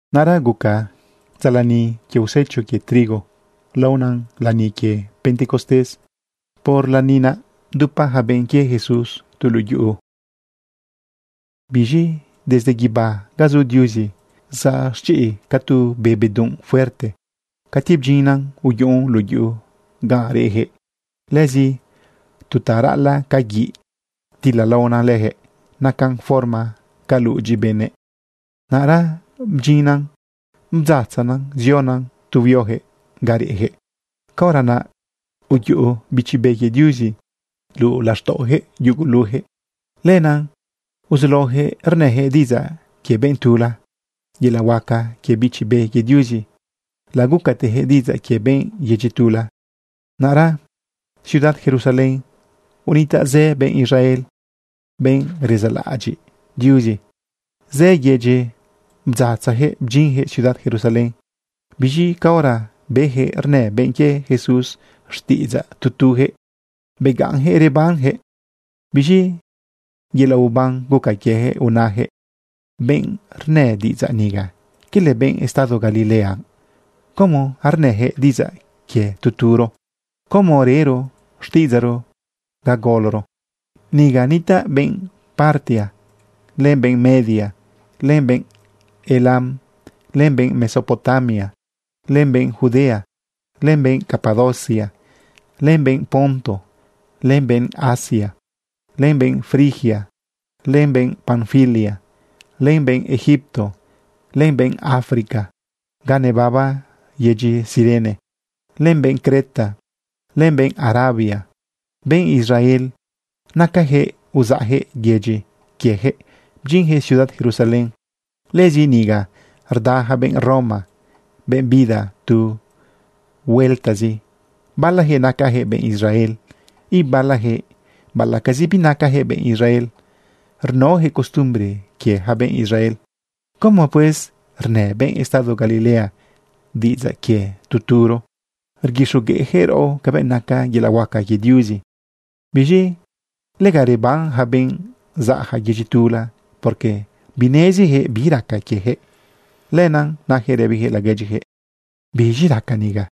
Naꞌra guca dza lani quie usecho quie trigo laona lani quie pentecostés. Por lani naꞌ, bdupa yaca benꞌ quie Jesús tu luꞌu yuꞌu. Biz̃i desde guibá ga zu Diuzi zaꞌ chiꞌ ca tu be bedunꞌ fuerte. Cati bdyinnan, uyuꞌun luꞌu yuꞌu gan reꞌyaquëꞌ. Lëzi, tu ta raꞌalaꞌ ca guiꞌ ptilalaonan leyaquëꞌ. Nacan forma ca ludyi benëꞌ. Naꞌra bdyinnan bdzatzana ziona tu huioyaquëꞌ ga reꞌyaquëꞌ. Caora naꞌ uyuꞌu Bichi Be quie Diuzi luꞌu laxtaꞌoyaquëꞌ yugulujëꞌ. Lenaꞌ uzulaoyaquëꞌ rnëyaquëꞌ diꞌidzaꞌ quie benꞌ tula. Yelaꞌ huaca quie Bichi Be quie Diuzi lagucateyaquëꞌ diꞌidzaꞌ quie benꞌ yedyi tula. Naꞌra ciudad Jerusalén unitaꞌ zë benꞌ Israel, benꞌ rezaꞌlaꞌadyiꞌ Diuzi. Zë yedyi bdzatzajëꞌ bdyinyaquëꞌ ciudad Jerusalén. Biz̃i caora beyaquëꞌ rnë benꞌ quie Jesús xtiꞌidzaꞌ tu tujëꞌ, begaꞌnyaquëꞌ rebanyaquëꞌ. Biz̃i yelaꞌ uban guca quieyaquëꞌ unayaquëꞌ: ―Benꞌ rnë diꞌidzaꞌ niga, ¿quele benꞌ estado Galilea? ¿Cómo arnëyaquëꞌ diꞌidzaꞌ quie tu turo? ¿Cómo rero xtiꞌidzaꞌro ga goloro? Niga nitaꞌ benꞌ Partia, len benꞌ Media, len benꞌ Elam, len benꞌ Mesopotamia, len benꞌ Judea, len benꞌ Capadocia, len benꞌ Ponto, len benꞌ Asia, len benꞌ Frigia, len benꞌ Panfilia, len benꞌ Egipto, len benꞌ Africa ga nebaba yedyi Cirene, len benꞌ Creta len benꞌ Arabia. Benꞌ Israel nacayaquëꞌ. Uzaꞌyaquëꞌ yedyi quiejëꞌ bdyinyaquëꞌ ciudad Jerusalén. Lëzi niga rda yaca benꞌ Roma, benꞌ bida tu hueltazi. Balayaquëꞌ nacayaquëꞌ benꞌ Israel, ibalayaquëꞌ baꞌalaꞌcazi binacayaquëꞌ benꞌ Israel, rnaoyaquëꞌ costumbre quie ja benꞌ Israel. ¿Cómo, pues, rnë benꞌ estado Galilea diꞌidzaꞌ quie tu turo, rguixogueꞌyaquëꞌ raꞌo cabëꞌ naca yelaꞌ huaca quie Diuzi? Biz̃i lega reban ja benꞌ zaꞌja yedyi tula, porque binezijëꞌ bi raca quiejëꞌ. Lenaꞌ nayaquëꞌ rëbijëꞌ laguedyiyaquëꞌ: ―¿Biz̃i raca niga?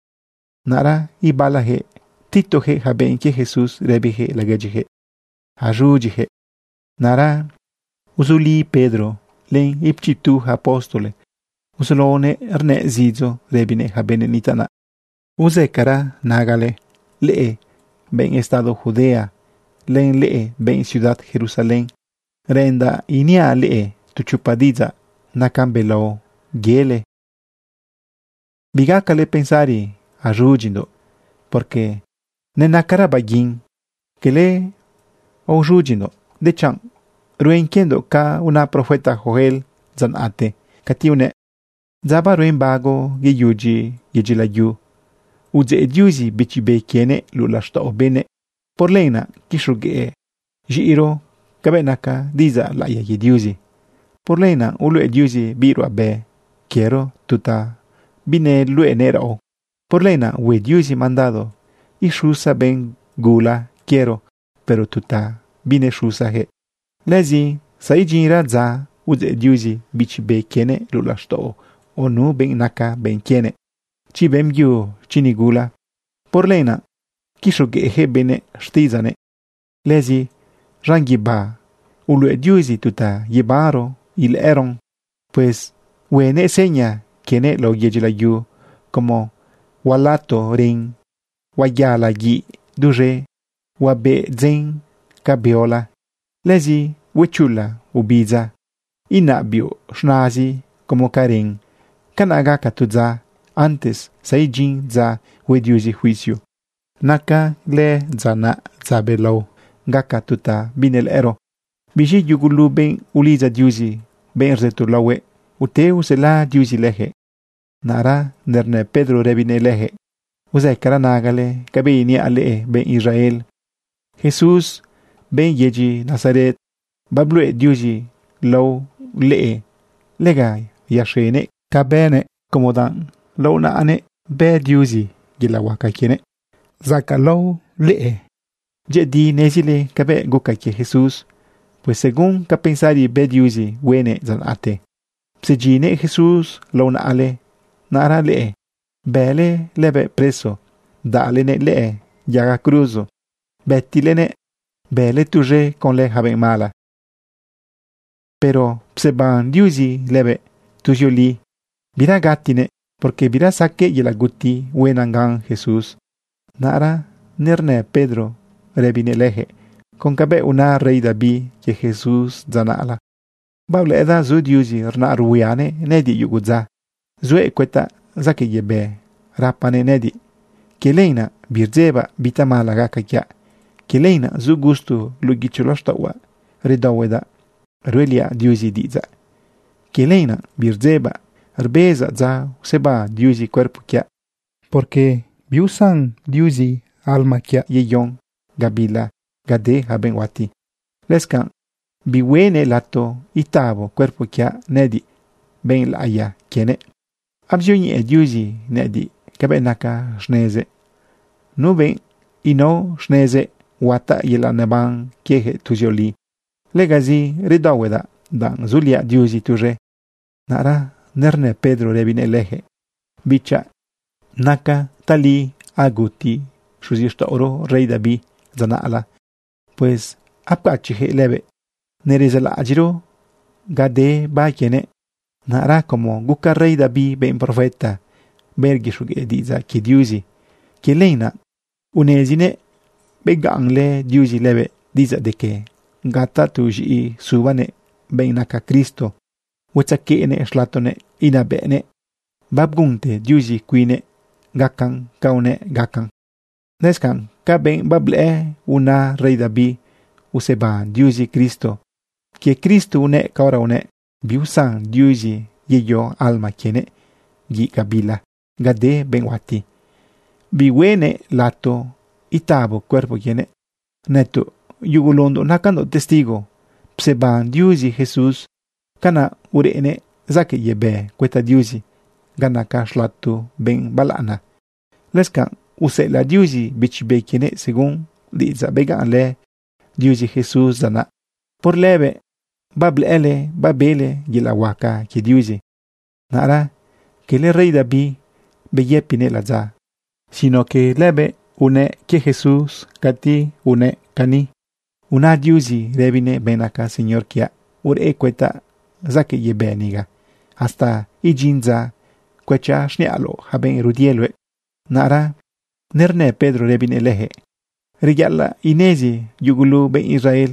Naꞌra ibalayaquëꞌ ptitojëꞌ yaca benꞌ quie Jesús rëbiyaquëꞌ laguedyijëꞌ: ―Az̃udyiyaquëꞌ. Naꞌra uzuli Pedro len ichiptu ja apóstol. Uzulaonëꞌ rnëꞌ zidzo rëbinëꞌ yaca benëꞌ nitaꞌ naꞌ: ―Uzëcara nagale, leꞌe benꞌ estado Judea len leꞌe benꞌ ciudad Jerusalén. Reꞌendaꞌ iniaꞌ leꞌe tu chopa diꞌidzaꞌ nacan belao yele. Bigacale pensari aoz̃udyindoꞌ, porque nenacara baguin. Cala aoz̃udyindoꞌ, dechanꞌ ruen quiendoꞌ ca una profeta Joel dza naꞌte cati unëꞌ: Dza baruen bago yedu yedyi layu, udzeꞌ Diuzi Bichi Be quienëꞌ luꞌu laxtaꞌo benëꞌ. Por lenaꞌ quixogueꞌ z̃iꞌiro cabëꞌ naca diꞌidzaꞌ laꞌiya quie Diuzi. Por lenaꞌ uluꞌe Diuzi biꞌ ruꞌabe quiero tu ta bineluꞌenëꞌ raꞌo. Por lenaꞌ hue Diuzi mandado ixusa benꞌ gula quiero, pero tu ta binexusayaquëꞌ. Lëzi zaidyinra dza, udzeꞌ Diuzi Bichi Be quienëꞌ luꞌu laxtaꞌo nu benꞌ naca benꞌ quienëꞌ, chi beꞌmbyu, chi nigula. Por lenaꞌ quixogueꞌjëꞌ benëꞌ xtiꞌidzaꞌnëꞌ. Lëzi z̃an guibá uluꞌe Diuzi tu ta yebanro ilëꞌëron. Pues huenëꞌ seña quienëꞌ lao yedyi layu como hualato ren, huayala guiꞌ duz̃e, huabeꞌ dzen ca beola. Lëzi huechula obidza, inaꞌ biuꞌ z̃nazi como ca ren. Canaꞌ gaca tu dza antes zaidyin dza hue Diuzi juicio. Naca lëdza naꞌ dza belao, gaca tu ta binelëꞌëro. Biz̃i yugulu benꞌ ulidza Diuzi, benꞌ rzëto laohuëꞌ, ute usela Diuzi leyaquëꞌ. Naꞌra nernë Pedro rëbinëꞌ leyaquëꞌ: ―Uzëcara nagale cabëꞌ iniaꞌ leꞌe benꞌ Israel. Jesús, benꞌ yedyi Nazaret, babluꞌe Diuzi lao leꞌe lega yaxenëꞌ ca bënëꞌ como danꞌ lao naꞌanëꞌ bë Diuzi yelaꞌ huaca quienëꞌ zacaꞌlao leꞌe. Dyëꞌëdi nezile cabëꞌ guca quie Jesús. Pues según ca pensari bë Diuzi huenëꞌ dza naꞌte, napsedyinnëꞌ Jesús lao naꞌale. Naꞌra leꞌe bële lëbëꞌ preso, bdaꞌlenëꞌ lëꞌë yaga cruzo bëtilenëꞌ, bële tuz̃e conlë yaca benꞌ mala. Pero pseban Diuzi lëbëꞌ. Tuzioli bira gatinëꞌ, porque bira saqueꞌ yelaꞌ guti huenan gan Jesús. Naꞌra nernë Pedro rëbinëꞌ leyaquëꞌ con cabëꞌ una rey David quie Jesús dza naꞌla: Bablëꞌëdaꞌ zu Diuzi rnaꞌ ruhuianëꞌ nëꞌëdiꞌ yugu dza. Zuëꞌ cuëtaꞌ zaquëꞌ yebë rapanëꞌ nëꞌëdiꞌ. Quie lenaꞌ birdzebaꞌ bi tamala gaca quiaꞌ. Quie lenaꞌ zu gusto luꞌu guichi laxtaꞌohuaꞌ, redaohuedaꞌ ruꞌeliaꞌ Diuzi diꞌidzaꞌ. Quie lenaꞌ birdzebaꞌ rbezaꞌ dza useban Diuzi cuerpo quiaꞌ, porque biusan Diuzi alma quiaꞌ yeyon gabila ga de yaca benꞌ huati. Lëscanꞌ bihueꞌnëꞌ lato itabo cuerpo quiaꞌ nëꞌëdiꞌ, benꞌ laꞌiya quienëꞌ. Abzioñeꞌe Diuzi nëꞌëdiꞌ cabëꞌ naca xnezëꞌ. Nu benꞌ inao xnezëꞌ, huataꞌ yelaꞌ neban quieyaquëꞌ tuzioli. Legazi redaohuedaꞌ danꞌ zuliaꞌ Diuzi tuz̃e. Naꞌra nernë Pedro rëbinëꞌ leyaquëꞌ: ―Bichaꞌ, nacan tali aguti xuzixtaꞌoro rey David dza naꞌla. Pues apcachiꞌyaquëꞌ lëbëꞌ, nerezaꞌlaꞌadyiꞌro ga de ba quienëꞌ. Naꞌra como guca rey David benꞌ profeta, benꞌ rguixogueꞌ diꞌidzaꞌ quie Diuzi, quie lenaꞌ unezinëꞌ begaꞌnlë Diuzi lëbëꞌ diꞌidzaꞌ de que gaca tu z̃iꞌi subanëꞌ benꞌ naca Cristo, huatzequeꞌnëꞌ xlatonëꞌ inabëꞌnëꞌ. Babgunte Diuzi cuinnëꞌ gacan ca unëꞌ gacan. Lëscanꞌ ca benꞌ bablëꞌë una rey David useban Diuzi Cristo. Quie Cristo unëꞌ caora unëꞌ biusan Diuzi yeyo alma quienëꞌ guiꞌ gabila ga de benꞌ huati. Bihueꞌnëꞌ lato itabo cuerpo quienëꞌ. Nëtoꞌ yugulundoꞌ nacandoꞌ testigo pseban Diuzi Jesús. Canaꞌ ureꞌnëꞌ zaquëꞌ yebë cuëta Diuzi ga naca xlato benꞌ balaꞌana. Lëscanꞌ useꞌelaꞌ Diuzi Bichi Be quienëꞌ según diꞌidzaꞌ begaꞌnlë Diuzi Jesús dza naꞌ. Por lëbëꞌ bablëꞌële babele yelaꞌ huaca quie Diuzi. Naꞌra quele rey David beyëpinëꞌ ladza, sino que lëbëꞌ unëꞌ quie Jesús cati unëꞌ cani: Una Diuzi rëbinëꞌ benꞌ naca Señor quiaꞌ: “Ureꞌ cuëtaꞌ zaquëꞌ yebë niga, hasta idyin dza cuëchaꞌ xniꞌaloꞌ ja benꞌ rudie luëꞌ.” Naꞌra nernë Pedro rëbinëꞌ leyaquëꞌ: ―Reyaꞌalaꞌ inezi yugulu benꞌ Israel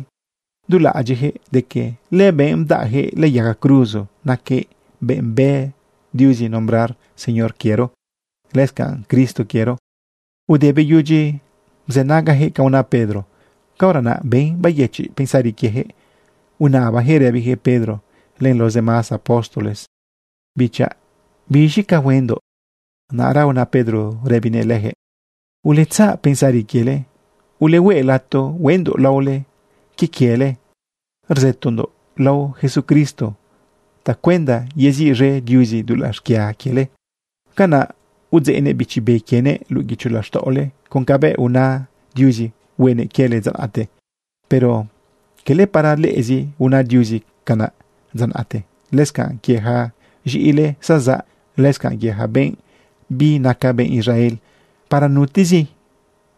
du laꞌadyiꞌyaquëꞌ de que lëbenꞌ bdaꞌyaquëꞌ lëꞌë yaga cruzo naquëꞌ benꞌ bë Diuzi nombrar Señor quiero lëscanꞌ Cristo quiero. Ude beyudyi bzënagayaquëꞌ ca una Pedro, caora naꞌ ben bayëchiꞌ pensari quiejëꞌ unabayaquëꞌ rëbiyaquëꞌ Pedro len los demás apóstoles: ―Bichaꞌ, ¿biz̃i ca huendoꞌ? Naꞌra una Pedro rëbinëꞌ leyaquëꞌ: ―Uletzaꞌ pensari quiele, ulehue lato hueꞌndoꞌ laole quie quiele rzëtondoꞌ lao Jesucristo tacuenda yeziꞌz̃e Diuzi dulaꞌ xquia quiele. Canaꞌ udzeꞌnëꞌ Bichi Be quienëꞌ luꞌu guicho laxtaꞌole con cabëꞌ una Diuzi huenëꞌ quiele dza naꞌte. Pero quele para leꞌezi una Diuzi canaꞌ dza naꞌte, lëscanꞌ quie ja z̃iꞌile zazaꞌ, lëscanꞌ quie ja benꞌ binaca benꞌ Israel, para nutezi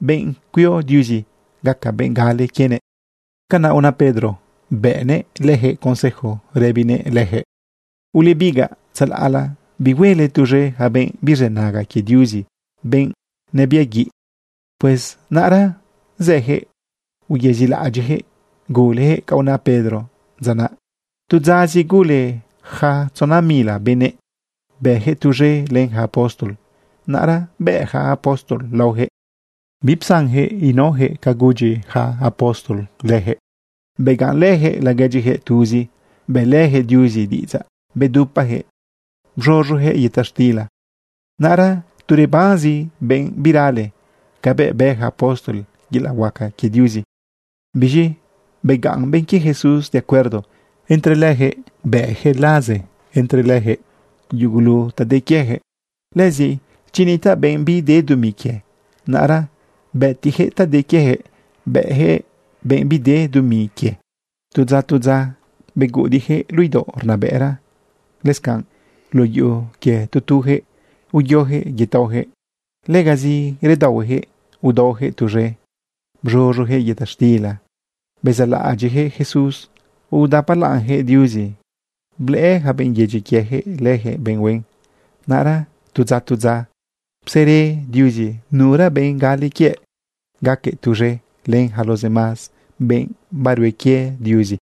benꞌ cuio Diuzi gaca benꞌ gale quienëꞌ. Canaꞌ una Pedro bëꞌnëꞌ leyaquëꞌ consejo rëbinëꞌ leyaquëꞌ: ―Ulebigaꞌ tzalaꞌla bihuele tuz̃e yaca benꞌ birzënaga quie Diuzi, benꞌ nebiaguiꞌ. Pues naꞌra zëyaquëꞌ uyezilaꞌadyiꞌjëꞌ gulejëꞌ ca una Pedro. Dza naꞌ, tu dzazi, gule ja tzona mila benëꞌ, bëjëꞌ tuz̃e len yaca apóstol. Naꞌra bëꞌ ja apóstol laoyaquëꞌ. Bipsanjëꞌ inaojëꞌ ca gudyi yaca apóstol leyaquëꞌ. Begaꞌnlëyaquëꞌ laguedyiyaquëꞌ tuzi, bëꞌlëyaquëꞌ Diuzi diꞌidzaꞌ, bedupajëꞌ bz̃uz̃uyaquëꞌ yëta xtila. Naꞌra tu rebanzi benꞌ birale cabëꞌ bë ja apóstol yelaꞌ milagro quie Diuzi. Biz̃i begaꞌn benꞌ quie Jesús de acuerdo entre leyaquëꞌ, bëꞌyaquëꞌ laze entre lëjëꞌ yugulu ta de quieyaquëꞌ. Lëzi chi nitaꞌ benꞌ bide dumi quie, naꞌra bëtiꞌyaquëꞌ ta de quieyaquëꞌ bëꞌyaquëꞌ benꞌ bide dumi quie. Tu dza, tu dza, beguꞌudiꞌyaquëꞌ luꞌu idaoꞌ rnabëꞌra, lëscanꞌ luꞌu yuꞌu quie tu tuyaquëꞌ uyoyaquëꞌ yetaoyaquëꞌ. Legazi redaohueyaquëꞌ udaoyaquëꞌ tuz̃e, bz̃uz̃uyaquëꞌ yëta xtila bezaꞌlaꞌadyiꞌjëꞌ Jesús, udapalaꞌnyaquëꞌ Diuzi. Blëꞌë yaca benꞌ yedyi quieyaquëꞌ leyaquëꞌ ben huen. Naꞌra tu dza, tu dza, psere Diuzi nura benꞌ gale quiëꞌ, gaquëꞌ tuz̃e len yaca los demás benꞌ barue quie Diuzi.